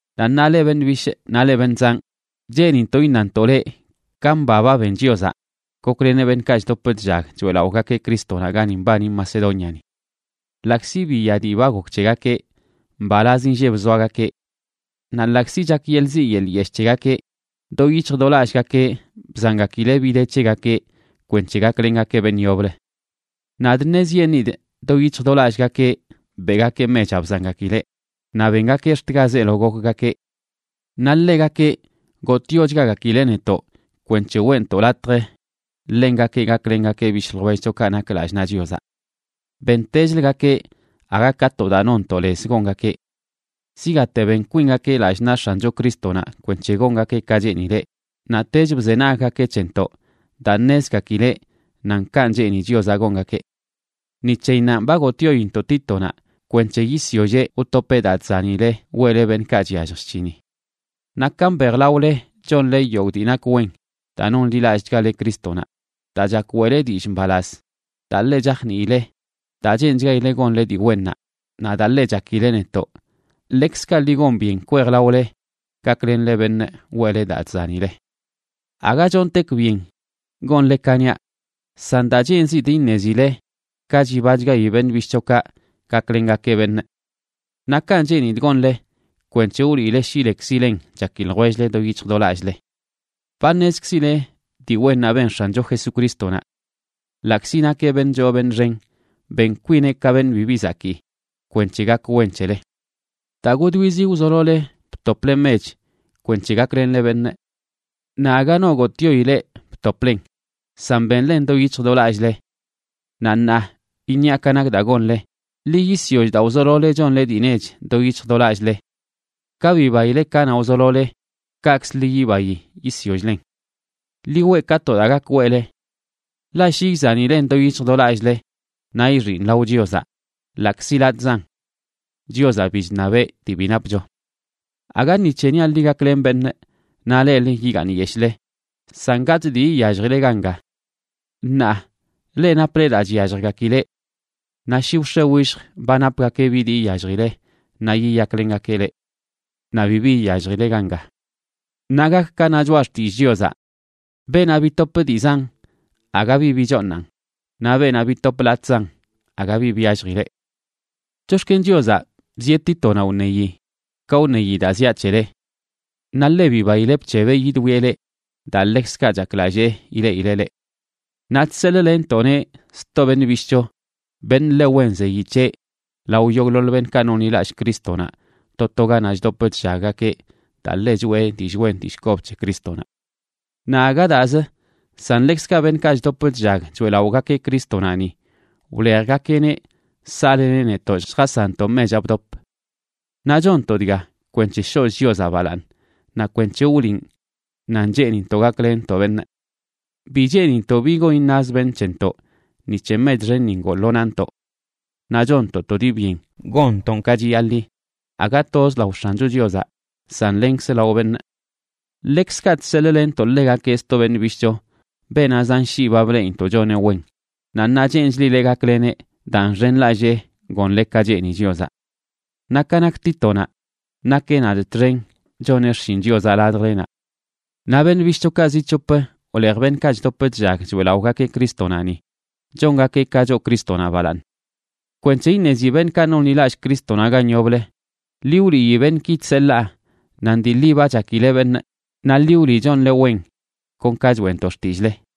Naꞌ ṉaa, leꞌ beṉꞌ bishꞌ naꞌ leꞌ beṉꞌ zanꞌ, cheenintoꞌ iṉantoꞌ leꞌ ka mba ba ben Chiozaꞌ gokleneꞌ beṉꞌkaꞌ chdop chllag choeꞌlaꞌogakeꞌ Crístonaꞌ gani mbani Macedóniani. Ḻaꞌkzi biya dii ba gok c̱hegakeꞌ, mbalaz inlleb zoagakeꞌ. Naꞌ ḻaꞌkzi chak yeḻꞌ ziꞌ yeḻꞌ yeshꞌ c̱hegakeꞌ, do yic̱hj do lallꞌgakeꞌ bzangakileꞌ bi de c̱hegakeꞌ kwenc̱he gaklengakeꞌ beṉꞌ yoblə. Nadꞌ ṉezyeṉꞌidꞌ do yic̱hj do lallꞌgakeꞌ beꞌgakeꞌ mechaꞌ bzangakileꞌ, naꞌ bengakeꞌ ax̱t ga zeelo gokgakeꞌ. Naꞌ ḻegakeꞌ gotꞌyochgagakileꞌ netoꞌ kweṉche weꞌntoꞌ latj ḻengakeꞌ gaklengakeꞌ bishꞌ ljwellchokaꞌ nak lallꞌ naꞌ Chiozaꞌ. Bentechlgakeꞌ aga ka to daa nonntoꞌ lez gongakeꞌ. Zigaate ben kwingakeꞌ lallꞌ naꞌ X̱ancho Crístonaꞌ kwenc̱he gongakeꞌ ka cheenileꞌ, naꞌtech bzenaggakeꞌ c̱hentoꞌ daa ṉezgakileꞌ nan kanꞌ cheeni Chiozaꞌ gongakeꞌ. Ni c̱heyinnanꞌ ba gotꞌyointoꞌ Títonaꞌ kwenc̱he yisyolleꞌ wtopeꞌ daa chzanile weꞌle beṉꞌkaꞌ chyallj chc̱hini. Naꞌ ka mbejlaole chonle yogꞌ dii nak wen: daa nonḻilallꞌchgale Crístonaꞌ, daa chak weꞌle dillꞌ mbalaz, daa ḻe chajniile, daa cheenchgaile gonle dii wennaꞌ, naꞌ daa ḻe chakileꞌ netoꞌ, ḻekzkaꞌ ḻi gon byen kwejlaole gaklenle beṉꞌ weꞌle daa chzanile. Aga chontekꞌ byen gonle ka niaꞌ, san daa cheenzidꞌ iṉezile ka chibachgayi beṉꞌ bishꞌchokaꞌ gaklengakeꞌ beṉꞌ, naꞌ kanꞌ cheenidꞌ gonle, kwenc̱he wliꞌle shi lekzilen chaki ljwell-le do yic̱hj do lallꞌle. Ba ṉezkzile dii wennaꞌ ben X̱ancho Jesucrístonaꞌ. Ḻaꞌkzi nakeꞌ beṉꞌ choo beṉꞌ xen, ben kwineꞌ ka beṉꞌ bibi zakii kwenc̱he gak wen c̱hele. Daa godwizi wzolole btople mech kwenc̱he gaklenle beṉꞌ. Naꞌ aga no gotꞌyoi leꞌ btoplen, san benlen do yic̱hj do lallꞌle. Naꞌ ṉaa iṉiaꞌ ka nak daa gonle: ḻi yisyoll daa wzolole chonle dii nech do yic̱hj do lallꞌle. Ka bibaile kanaꞌ wzolole, kaꞌkzə ḻi yibayi yisyoll-len. Ḻi weꞌ ka to daa gak weꞌle. Ḻaꞌ shi izanilen do yic̱hj do lallꞌle, naꞌ ixinꞌ lao Chiozaꞌ, ḻaꞌkzi latꞌzan. Chiozaꞌ bi chṉabeꞌ dii bi napcho. Aga ni c̱he niaꞌ leꞌ gaklenle beṉꞌ naꞌ leꞌlə yigaaṉ yeshꞌle, san gatꞌ dii iyalljile ganga. Ṉaa leꞌ naple daa chyalljgakileꞌ. Naꞌ shi wx̱e willj ba napgakeꞌ bi dii iyalljile, naꞌ yiyaklengakeꞌ leꞌ. Naꞌ bibi iyalljile ganga. Naꞌ gak ka na Choꞌa Xtillꞌ Chiozaꞌ: “Beenaꞌ bitop dii zan, aga bi bichooṉan, naꞌ beenaꞌ bitop latꞌzan, aga bi byalljileꞌ.” Chox̱ken Chiozaꞌ bzieꞌ Títonaꞌ wṉeyi ka wṉeyi daa ziaꞌ c̱hele. Naꞌ ḻe bibaileꞌ bc̱hebeꞌ yidwieꞌ leꞌ, daa ḻekzkaꞌ chaklallee ileꞌileꞌ leꞌ. Naꞌ chseḻꞌlenntoꞌneꞌ sto beṉꞌ bishꞌcho, beṉꞌ ḻe wen zeyi c̱heꞌ lao yogꞌḻoḻ beṉꞌkaꞌ nonḻilallꞌ Crístonaꞌ to to ganaꞌ chdop chllaggakeꞌ, daa ḻe choꞌe dillꞌ wen dillꞌ kob c̱he Crístonaꞌ. Naꞌ aga daazə, san ḻekzkaꞌ beṉꞌkaꞌ chdop chllag choeꞌlaꞌogakeꞌ Crístonaꞌ ni, wlejgakeꞌneꞌ saꞌleneꞌ netoꞌ lljasanntoꞌ mechaꞌ bdop. Naꞌ chonntoꞌ dga kwenc̱he shoꞌch Chiozaꞌ balaaṉ naꞌ kweṉche wliꞌn nan cheenintoꞌ gaklenntoꞌ beṉꞌ. Bi cheenintoꞌ bi gon iṉaz beṉꞌ c̱hentoꞌ ni c̱he mech xenni ngoo lo nantoꞌ. Naꞌ chonntoꞌ to dii byen gonntoꞌn ka chiyaḻi, aga toz lao X̱ancho Chiozaꞌ san lenkz lao beṉꞌ. Ḻekzkaꞌ chseḻꞌlenntoꞌ ḻegakeꞌ sto beṉꞌ bishꞌcho, beenaꞌ zan shii ba bleꞌintoꞌ choneꞌ wen, naꞌ ṉaa cheenchlileꞌ gakleneꞌ daa nxenlallee gonle ka cheeni Chiozaꞌ. Naꞌ ka nak Títonaꞌ, nakeꞌ nadꞌ txen choneꞌ xshin Chiozaꞌ ladjlenaꞌ. Naꞌ beṉꞌ bishꞌchokaꞌ zi c̱hop wlej beṉꞌkaꞌ chdop chllag choeꞌlaꞌogakeꞌ Crístonaꞌ ni, chongakeꞌ ka choo Crístonaꞌ balaaṉ. Kwenc̱he iṉezi beṉꞌkaꞌ nonḻilallꞌ Crístonaꞌ gan yoblə, ḻi wliyi beṉꞌki chseḻaa nan dii ḻi ba chakile beṉꞌ, naꞌ ḻi wliꞌ chonle wen kon ka choeꞌntoꞌ xtillꞌle.